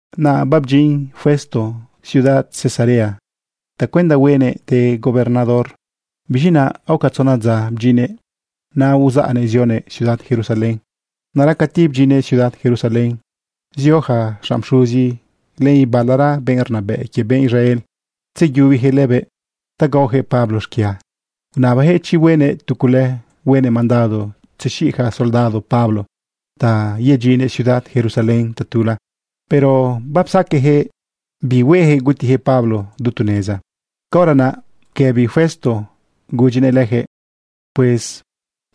Naꞌ babdyin Festo ciudad Cesarea tacuenda huenëꞌ de gobernador. Biz̃i naꞌ aoca tzona dza bdyinnëꞌ naꞌ, uzaꞌnëꞌ zionëꞌ ciudad Jerusalén. Naꞌra cati bdyinnëꞌ ciudad Jerusalén, zio yaca xanꞌ pxuzi len ibalara benꞌ rnabëꞌ quie benꞌ Israel tzeyubiyaquëꞌ lëbëꞌ ta gaoyaquëꞌ Pablo xquia. Unabayaquëꞌ chi huenëꞌ tu cule huenëꞌ mandado tzexiꞌ yaca soldado Pablo ta yedyinnëꞌ ciudad Jerusalén tatula. Pero bapsaqueꞌyaquëꞌ bi hueyaquëꞌ gutiyaquëꞌ Pablo du tu neza. Caora naꞌ bequëbi Festo gudyinëꞌ lejëꞌ: ―Pues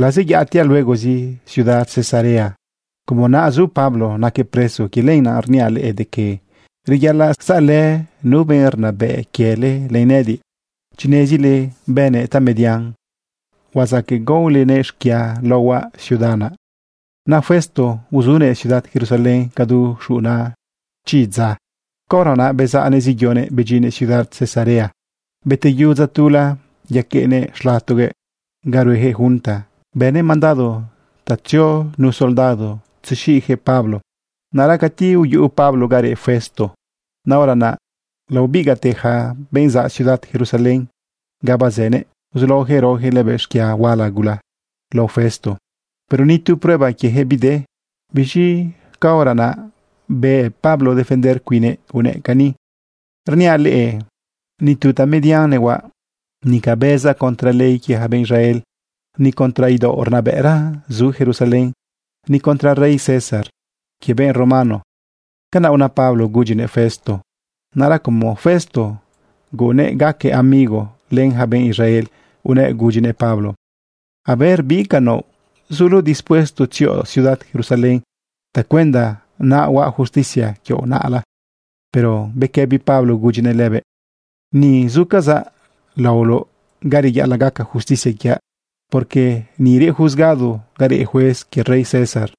lazeyaꞌatiaꞌ luegozi ciudad Cesarea. Como naꞌ zu Pablo naquëꞌ preso, quie lenaꞌ rniaꞌ leꞌe de que reyaꞌalaꞌ saꞌlë nu benꞌ rnabëꞌ quiele len nëꞌëdiꞌ. Chi nezile bënëꞌ tamedian, huazaqueꞌ gaolenëꞌ xquia laohuaꞌ ciudad naꞌ. Naꞌ Festo uzunëꞌ ciudad Jerusalén cadu xuꞌuna chi dza. Caora naꞌ bezaꞌnëꞌ zeyonëꞌ bedyinnëꞌ ciudad Cesarea. Beteyu dza tula, yaqueꞌnëꞌ xlatonëꞌ ga rueyaquëꞌ junta. Bënëꞌ mandado ta tzio nu soldado tzexiꞌyaquëꞌ Pablo. Naꞌra cati uyuꞌu Pablo ga reꞌ Festo naꞌ, hora naꞌ laobigaꞌte yaca benꞌ zaꞌ ciudad Jerusalén ganꞌ bazënëꞌ, uzulaojëꞌ raoyaquëꞌ lëbëꞌ xquia huala gula lao Festo. Pero ni tu prueba quieyaquëꞌ bide. Biz̃i caora naꞌ beꞌ Pablo defender cuinnëꞌ unëꞌ cani: ―Rniaꞌ leꞌe nitu tamedian nehuaꞌ. Nica bëzaꞌ contra ley quie ja benꞌ Israel, ni contra idaoꞌ rnabëꞌra zu Jerusalén, ni contra rey César quie benꞌ romano. ―Canaꞌ una Pablo gudyinëꞌ Festo. Naꞌra como Festo guꞌunnëꞌ gaquëꞌ amigo len ja benꞌ Israel, unëꞌ gudyinëꞌ Pablo: ―A ver bi ca naoꞌ. ¿Zuloꞌ dispuesto tzioꞌ ciudad Jerusalén tacuenda naꞌ huaꞌ justicia quioꞌ naꞌla? Pero bequëbi Pablo gudyinëꞌ lëbëꞌ: ―Ni zucazaꞌ laoloꞌ ga reyaꞌalaꞌ gaca justicia quiaꞌ, porque ni reꞌ juzgado ga reꞌ juez quie rey César.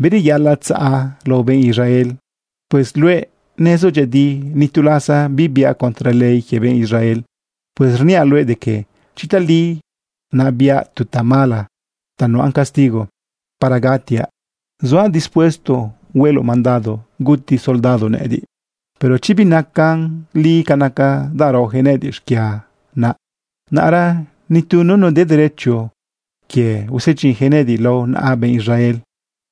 Bireyaꞌalaꞌ tzaꞌa lao benꞌ Israel. Pues luëꞌ nezoꞌ dyëꞌëdi nitu lasa bibiaꞌ contra ley quie benꞌ Israel. Pues rniaꞌ luëꞌ de que chi tali naꞌ biaꞌ tu tamala ta nuꞌan castigo para gatiaꞌ, zuaꞌ dispuesto hueloꞌ mandado guti ja soldado nëꞌëdiꞌ. Pero chi binacan li ca naca danꞌ raojëꞌ nëꞌëdiꞌ xquia naꞌ, naꞌra nitu nunu de derecho quie usedyinyaquëꞌ nëꞌëdiꞌ lao naꞌa yaca benꞌ Israel.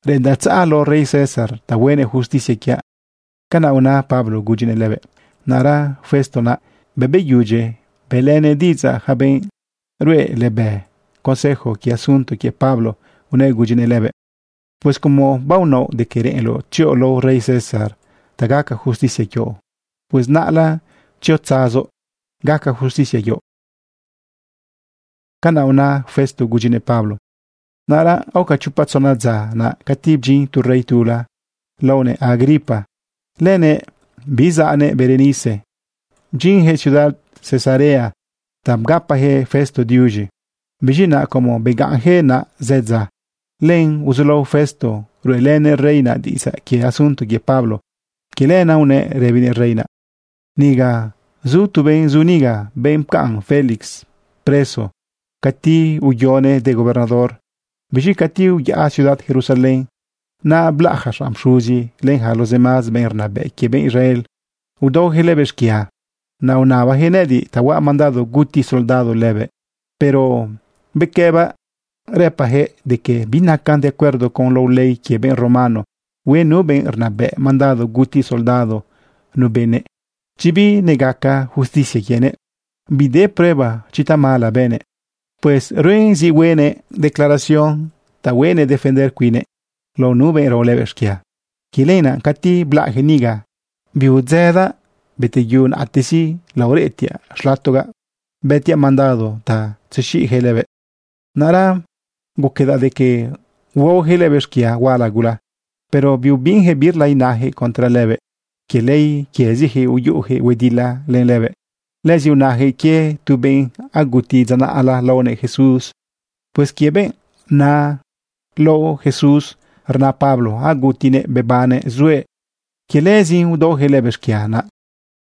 Reꞌendaꞌ tzaꞌa lao rey César ta huenëꞌ justicia quiaꞌ. ―Canaꞌ una Pablo gudyinëꞌ lëbëꞌ. Naꞌra Festo naꞌ, bëꞌ beyudyi bëꞌlënëꞌ diꞌidzaꞌ yaca benꞌ ruꞌe lëbëꞌ consejo quie asunto quie Pablo, unëꞌ gudyinëꞌ lëbëꞌ: ―Pues como baonaoꞌ de que reꞌenloꞌ tzioꞌ lao rey César ta gaca justicia quioꞌ, pues naꞌla tziotzazoꞌ gaca justicia quioꞌ. ―Canaꞌ una Festo gudyinëꞌ Pablo. Naꞌra aoca chopa tzona dza naꞌ, cati bdyin tu rey tula laonëꞌ Agripa lenëꞌ biꞌ zannëꞌ Berenice. Bdyinyaquëꞌ ciudad Cesarea ta bgapayaquëꞌ Festo diuz̃i. Biz̃i naꞌ como begaꞌnjëꞌ naꞌ zë dza, lenaꞌ uzulao Festo ruꞌelënëꞌ rey naꞌ diꞌidzaꞌ quie asunto quie Pablo. Quie lenaꞌ unëꞌ rëbinëꞌ rey naꞌ: ―Niga zu tu benꞌ zu niga, benꞌ pcaꞌn Félix preso cati uyonëꞌ de gobernador. Biz̃i cati uyaꞌa ciudad Jerusalén naꞌ, blaꞌ yaca xanꞌ pxuzi len yaca los demás benꞌ rnabëꞌ quie benꞌ Israel udaoyaquëꞌ lëbëꞌ xquia. Naꞌ unabajëꞌ nëꞌëdiꞌ ta huaꞌ mandado guti soldado lëbëꞌ. Pero bequëbaꞌ rëbaꞌyaquëꞌ de que binacan de acuerdo con lao ley quie benꞌ romano hue nu benꞌ rnabëꞌ mandado guti soldado nu benëꞌ chanꞌ binegaca justicia quienëꞌ bide prueba chi tamala bënëꞌ. Pues ruen zi hueꞌnëꞌ declaración ta huenëꞌ defender cuinnëꞌ lao nu benꞌ rao lëbëꞌ xquia. Quie lenaꞌ cati blaꞌyaquëꞌ niga, biudzëdaꞌ. Beteyu naꞌtezi laoreꞌtiaꞌ xlatogaꞌ bëtiaꞌ mandado ta tzexiꞌyaquëꞌ lëbëꞌ. Naꞌra guquedaꞌ de que huaoyaquëꞌ lëbëꞌ xquia huala gula, pero biubinyaquëꞌ birla inayaquëꞌ contra lëbëꞌ. Quie ley quiezijëꞌ uyuꞌuyaquëꞌ huedila len lëbëꞌ. Lëzi unayaquëꞌ quie tu benꞌ aguti dza naꞌla laonëꞌ Jesús. Pues quie benꞌ naꞌ lao Jesús, rna Pablo agutinëꞌ bebannëꞌ zuëꞌ. Quie lëzin udaoyaquëꞌ lëbëꞌ xquia. Naꞌ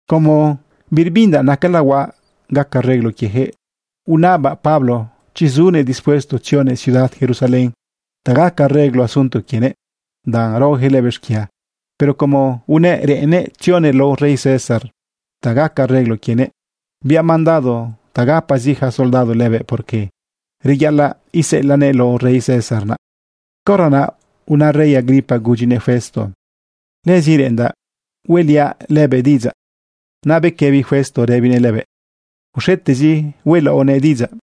como birbindaꞌ nacala huaꞌ gaca reglo quiejëꞌ, unabaꞌ Pablo chi zunëꞌ dispuesto tzionëꞌ ciudad Jerusalén ta gaca reglo asunto quienëꞌ danꞌ raojëꞌ lëbëꞌ xquia. Pero como unëꞌ reꞌennëꞌ tzionëꞌ lao rey César ta gaca reglo quienëꞌ, biaꞌ mandado ta gapazi ja soldado lëbëꞌ, porque reyaꞌalaꞌ iseꞌelaꞌnëꞌ lao rey César naꞌ. Caora naꞌ una rey Agripa gudyinëꞌ Festo: ―Lëzi reꞌendaꞌ hueꞌliaꞌ lëbëꞌ diꞌidzaꞌ. Naꞌ bequëbi Festo rëbinëꞌ lëbëꞌ: ―Uxetezi hueꞌlaoꞌnëꞌ diꞌidzaꞌ.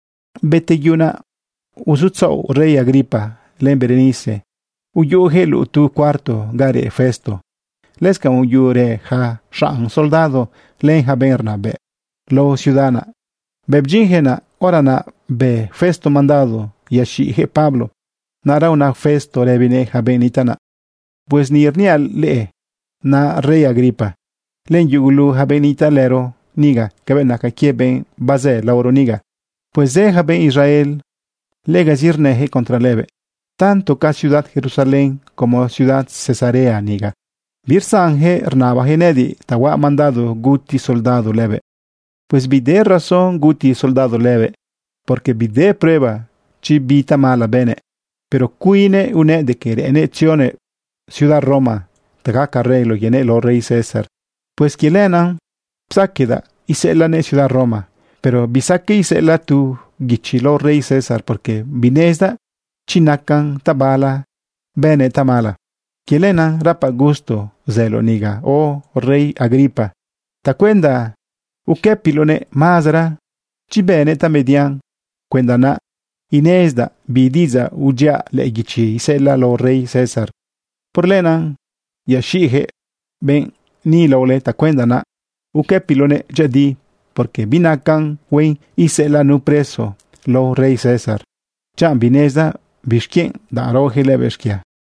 Beteyu naꞌ uzutzaꞌo rey Agripa len Berenice uyuꞌuyaquëꞌ luꞌu tu cuarto ga reꞌ Festo. Lëscanꞌ uyuꞌurë ja xanꞌ soldado len yaca benꞌ rnabëꞌ lao ciudad naꞌ. Bëꞌ bdyinjëꞌ naꞌ, hora naꞌ bë Festo mandado yaxiꞌjëꞌ Pablo. Naꞌra una Festo rëbinëꞌ yaca benꞌ nitaꞌ naꞌ: ―Pues ni rniaꞌ luëꞌ naꞌ, rey Agripa, len yugulu yaca benꞌ nitaꞌlëro niga cabëꞌ naca quie benꞌ bazë laoro niga. Pues zë yaca benꞌ Israel legazi rnëyaquëꞌ contra lëbëꞌ. Tanto ca ciudad Jerusalén, como ciudad Cesarea niga, birsanjëꞌ rnabayaquëꞌ nëꞌëdiꞌ ta huaꞌ mandado guti soldado lëbëꞌ. Pues bide razón guti soldado lëbëꞌ, porque bide prueba chi bi tamala bënëꞌ. Pero como cuinnëꞌ unëꞌ de que reꞌennëꞌ tzionëꞌ ciudad Roma ta gaca reglo quienëꞌ lao rey César, pues quie lenaꞌ psaqueꞌdaꞌ iseꞌelaꞌnëꞌ ciudad Roma. Pero bisaqueꞌ iseꞌelaꞌ tu guichi lao rey César, porque binenezdaꞌ chi nacan tabala bënëꞌ tamala. Quie lenaꞌ rapaꞌ gusto zëloꞌ niga, oh rey Agripa, tacuenda uquëpiloꞌnëꞌ mazera chi bënëꞌ tamedian cuenda naꞌ inezidaꞌ bi diꞌidzaꞌ udyiaꞌ lëꞌë guichi iseꞌelaꞌ lao rey César. Por lenaꞌ yaxiꞌjëꞌ benꞌ ni laole tacuenda naꞌ uquëpiloꞌnëꞌ dyëꞌëdi. Porque binacan huen iseꞌelaꞌ nu preso lao rey César, chanꞌ binezdaꞌ bixquienꞌ danꞌ raojëꞌ lëbëꞌ xquia.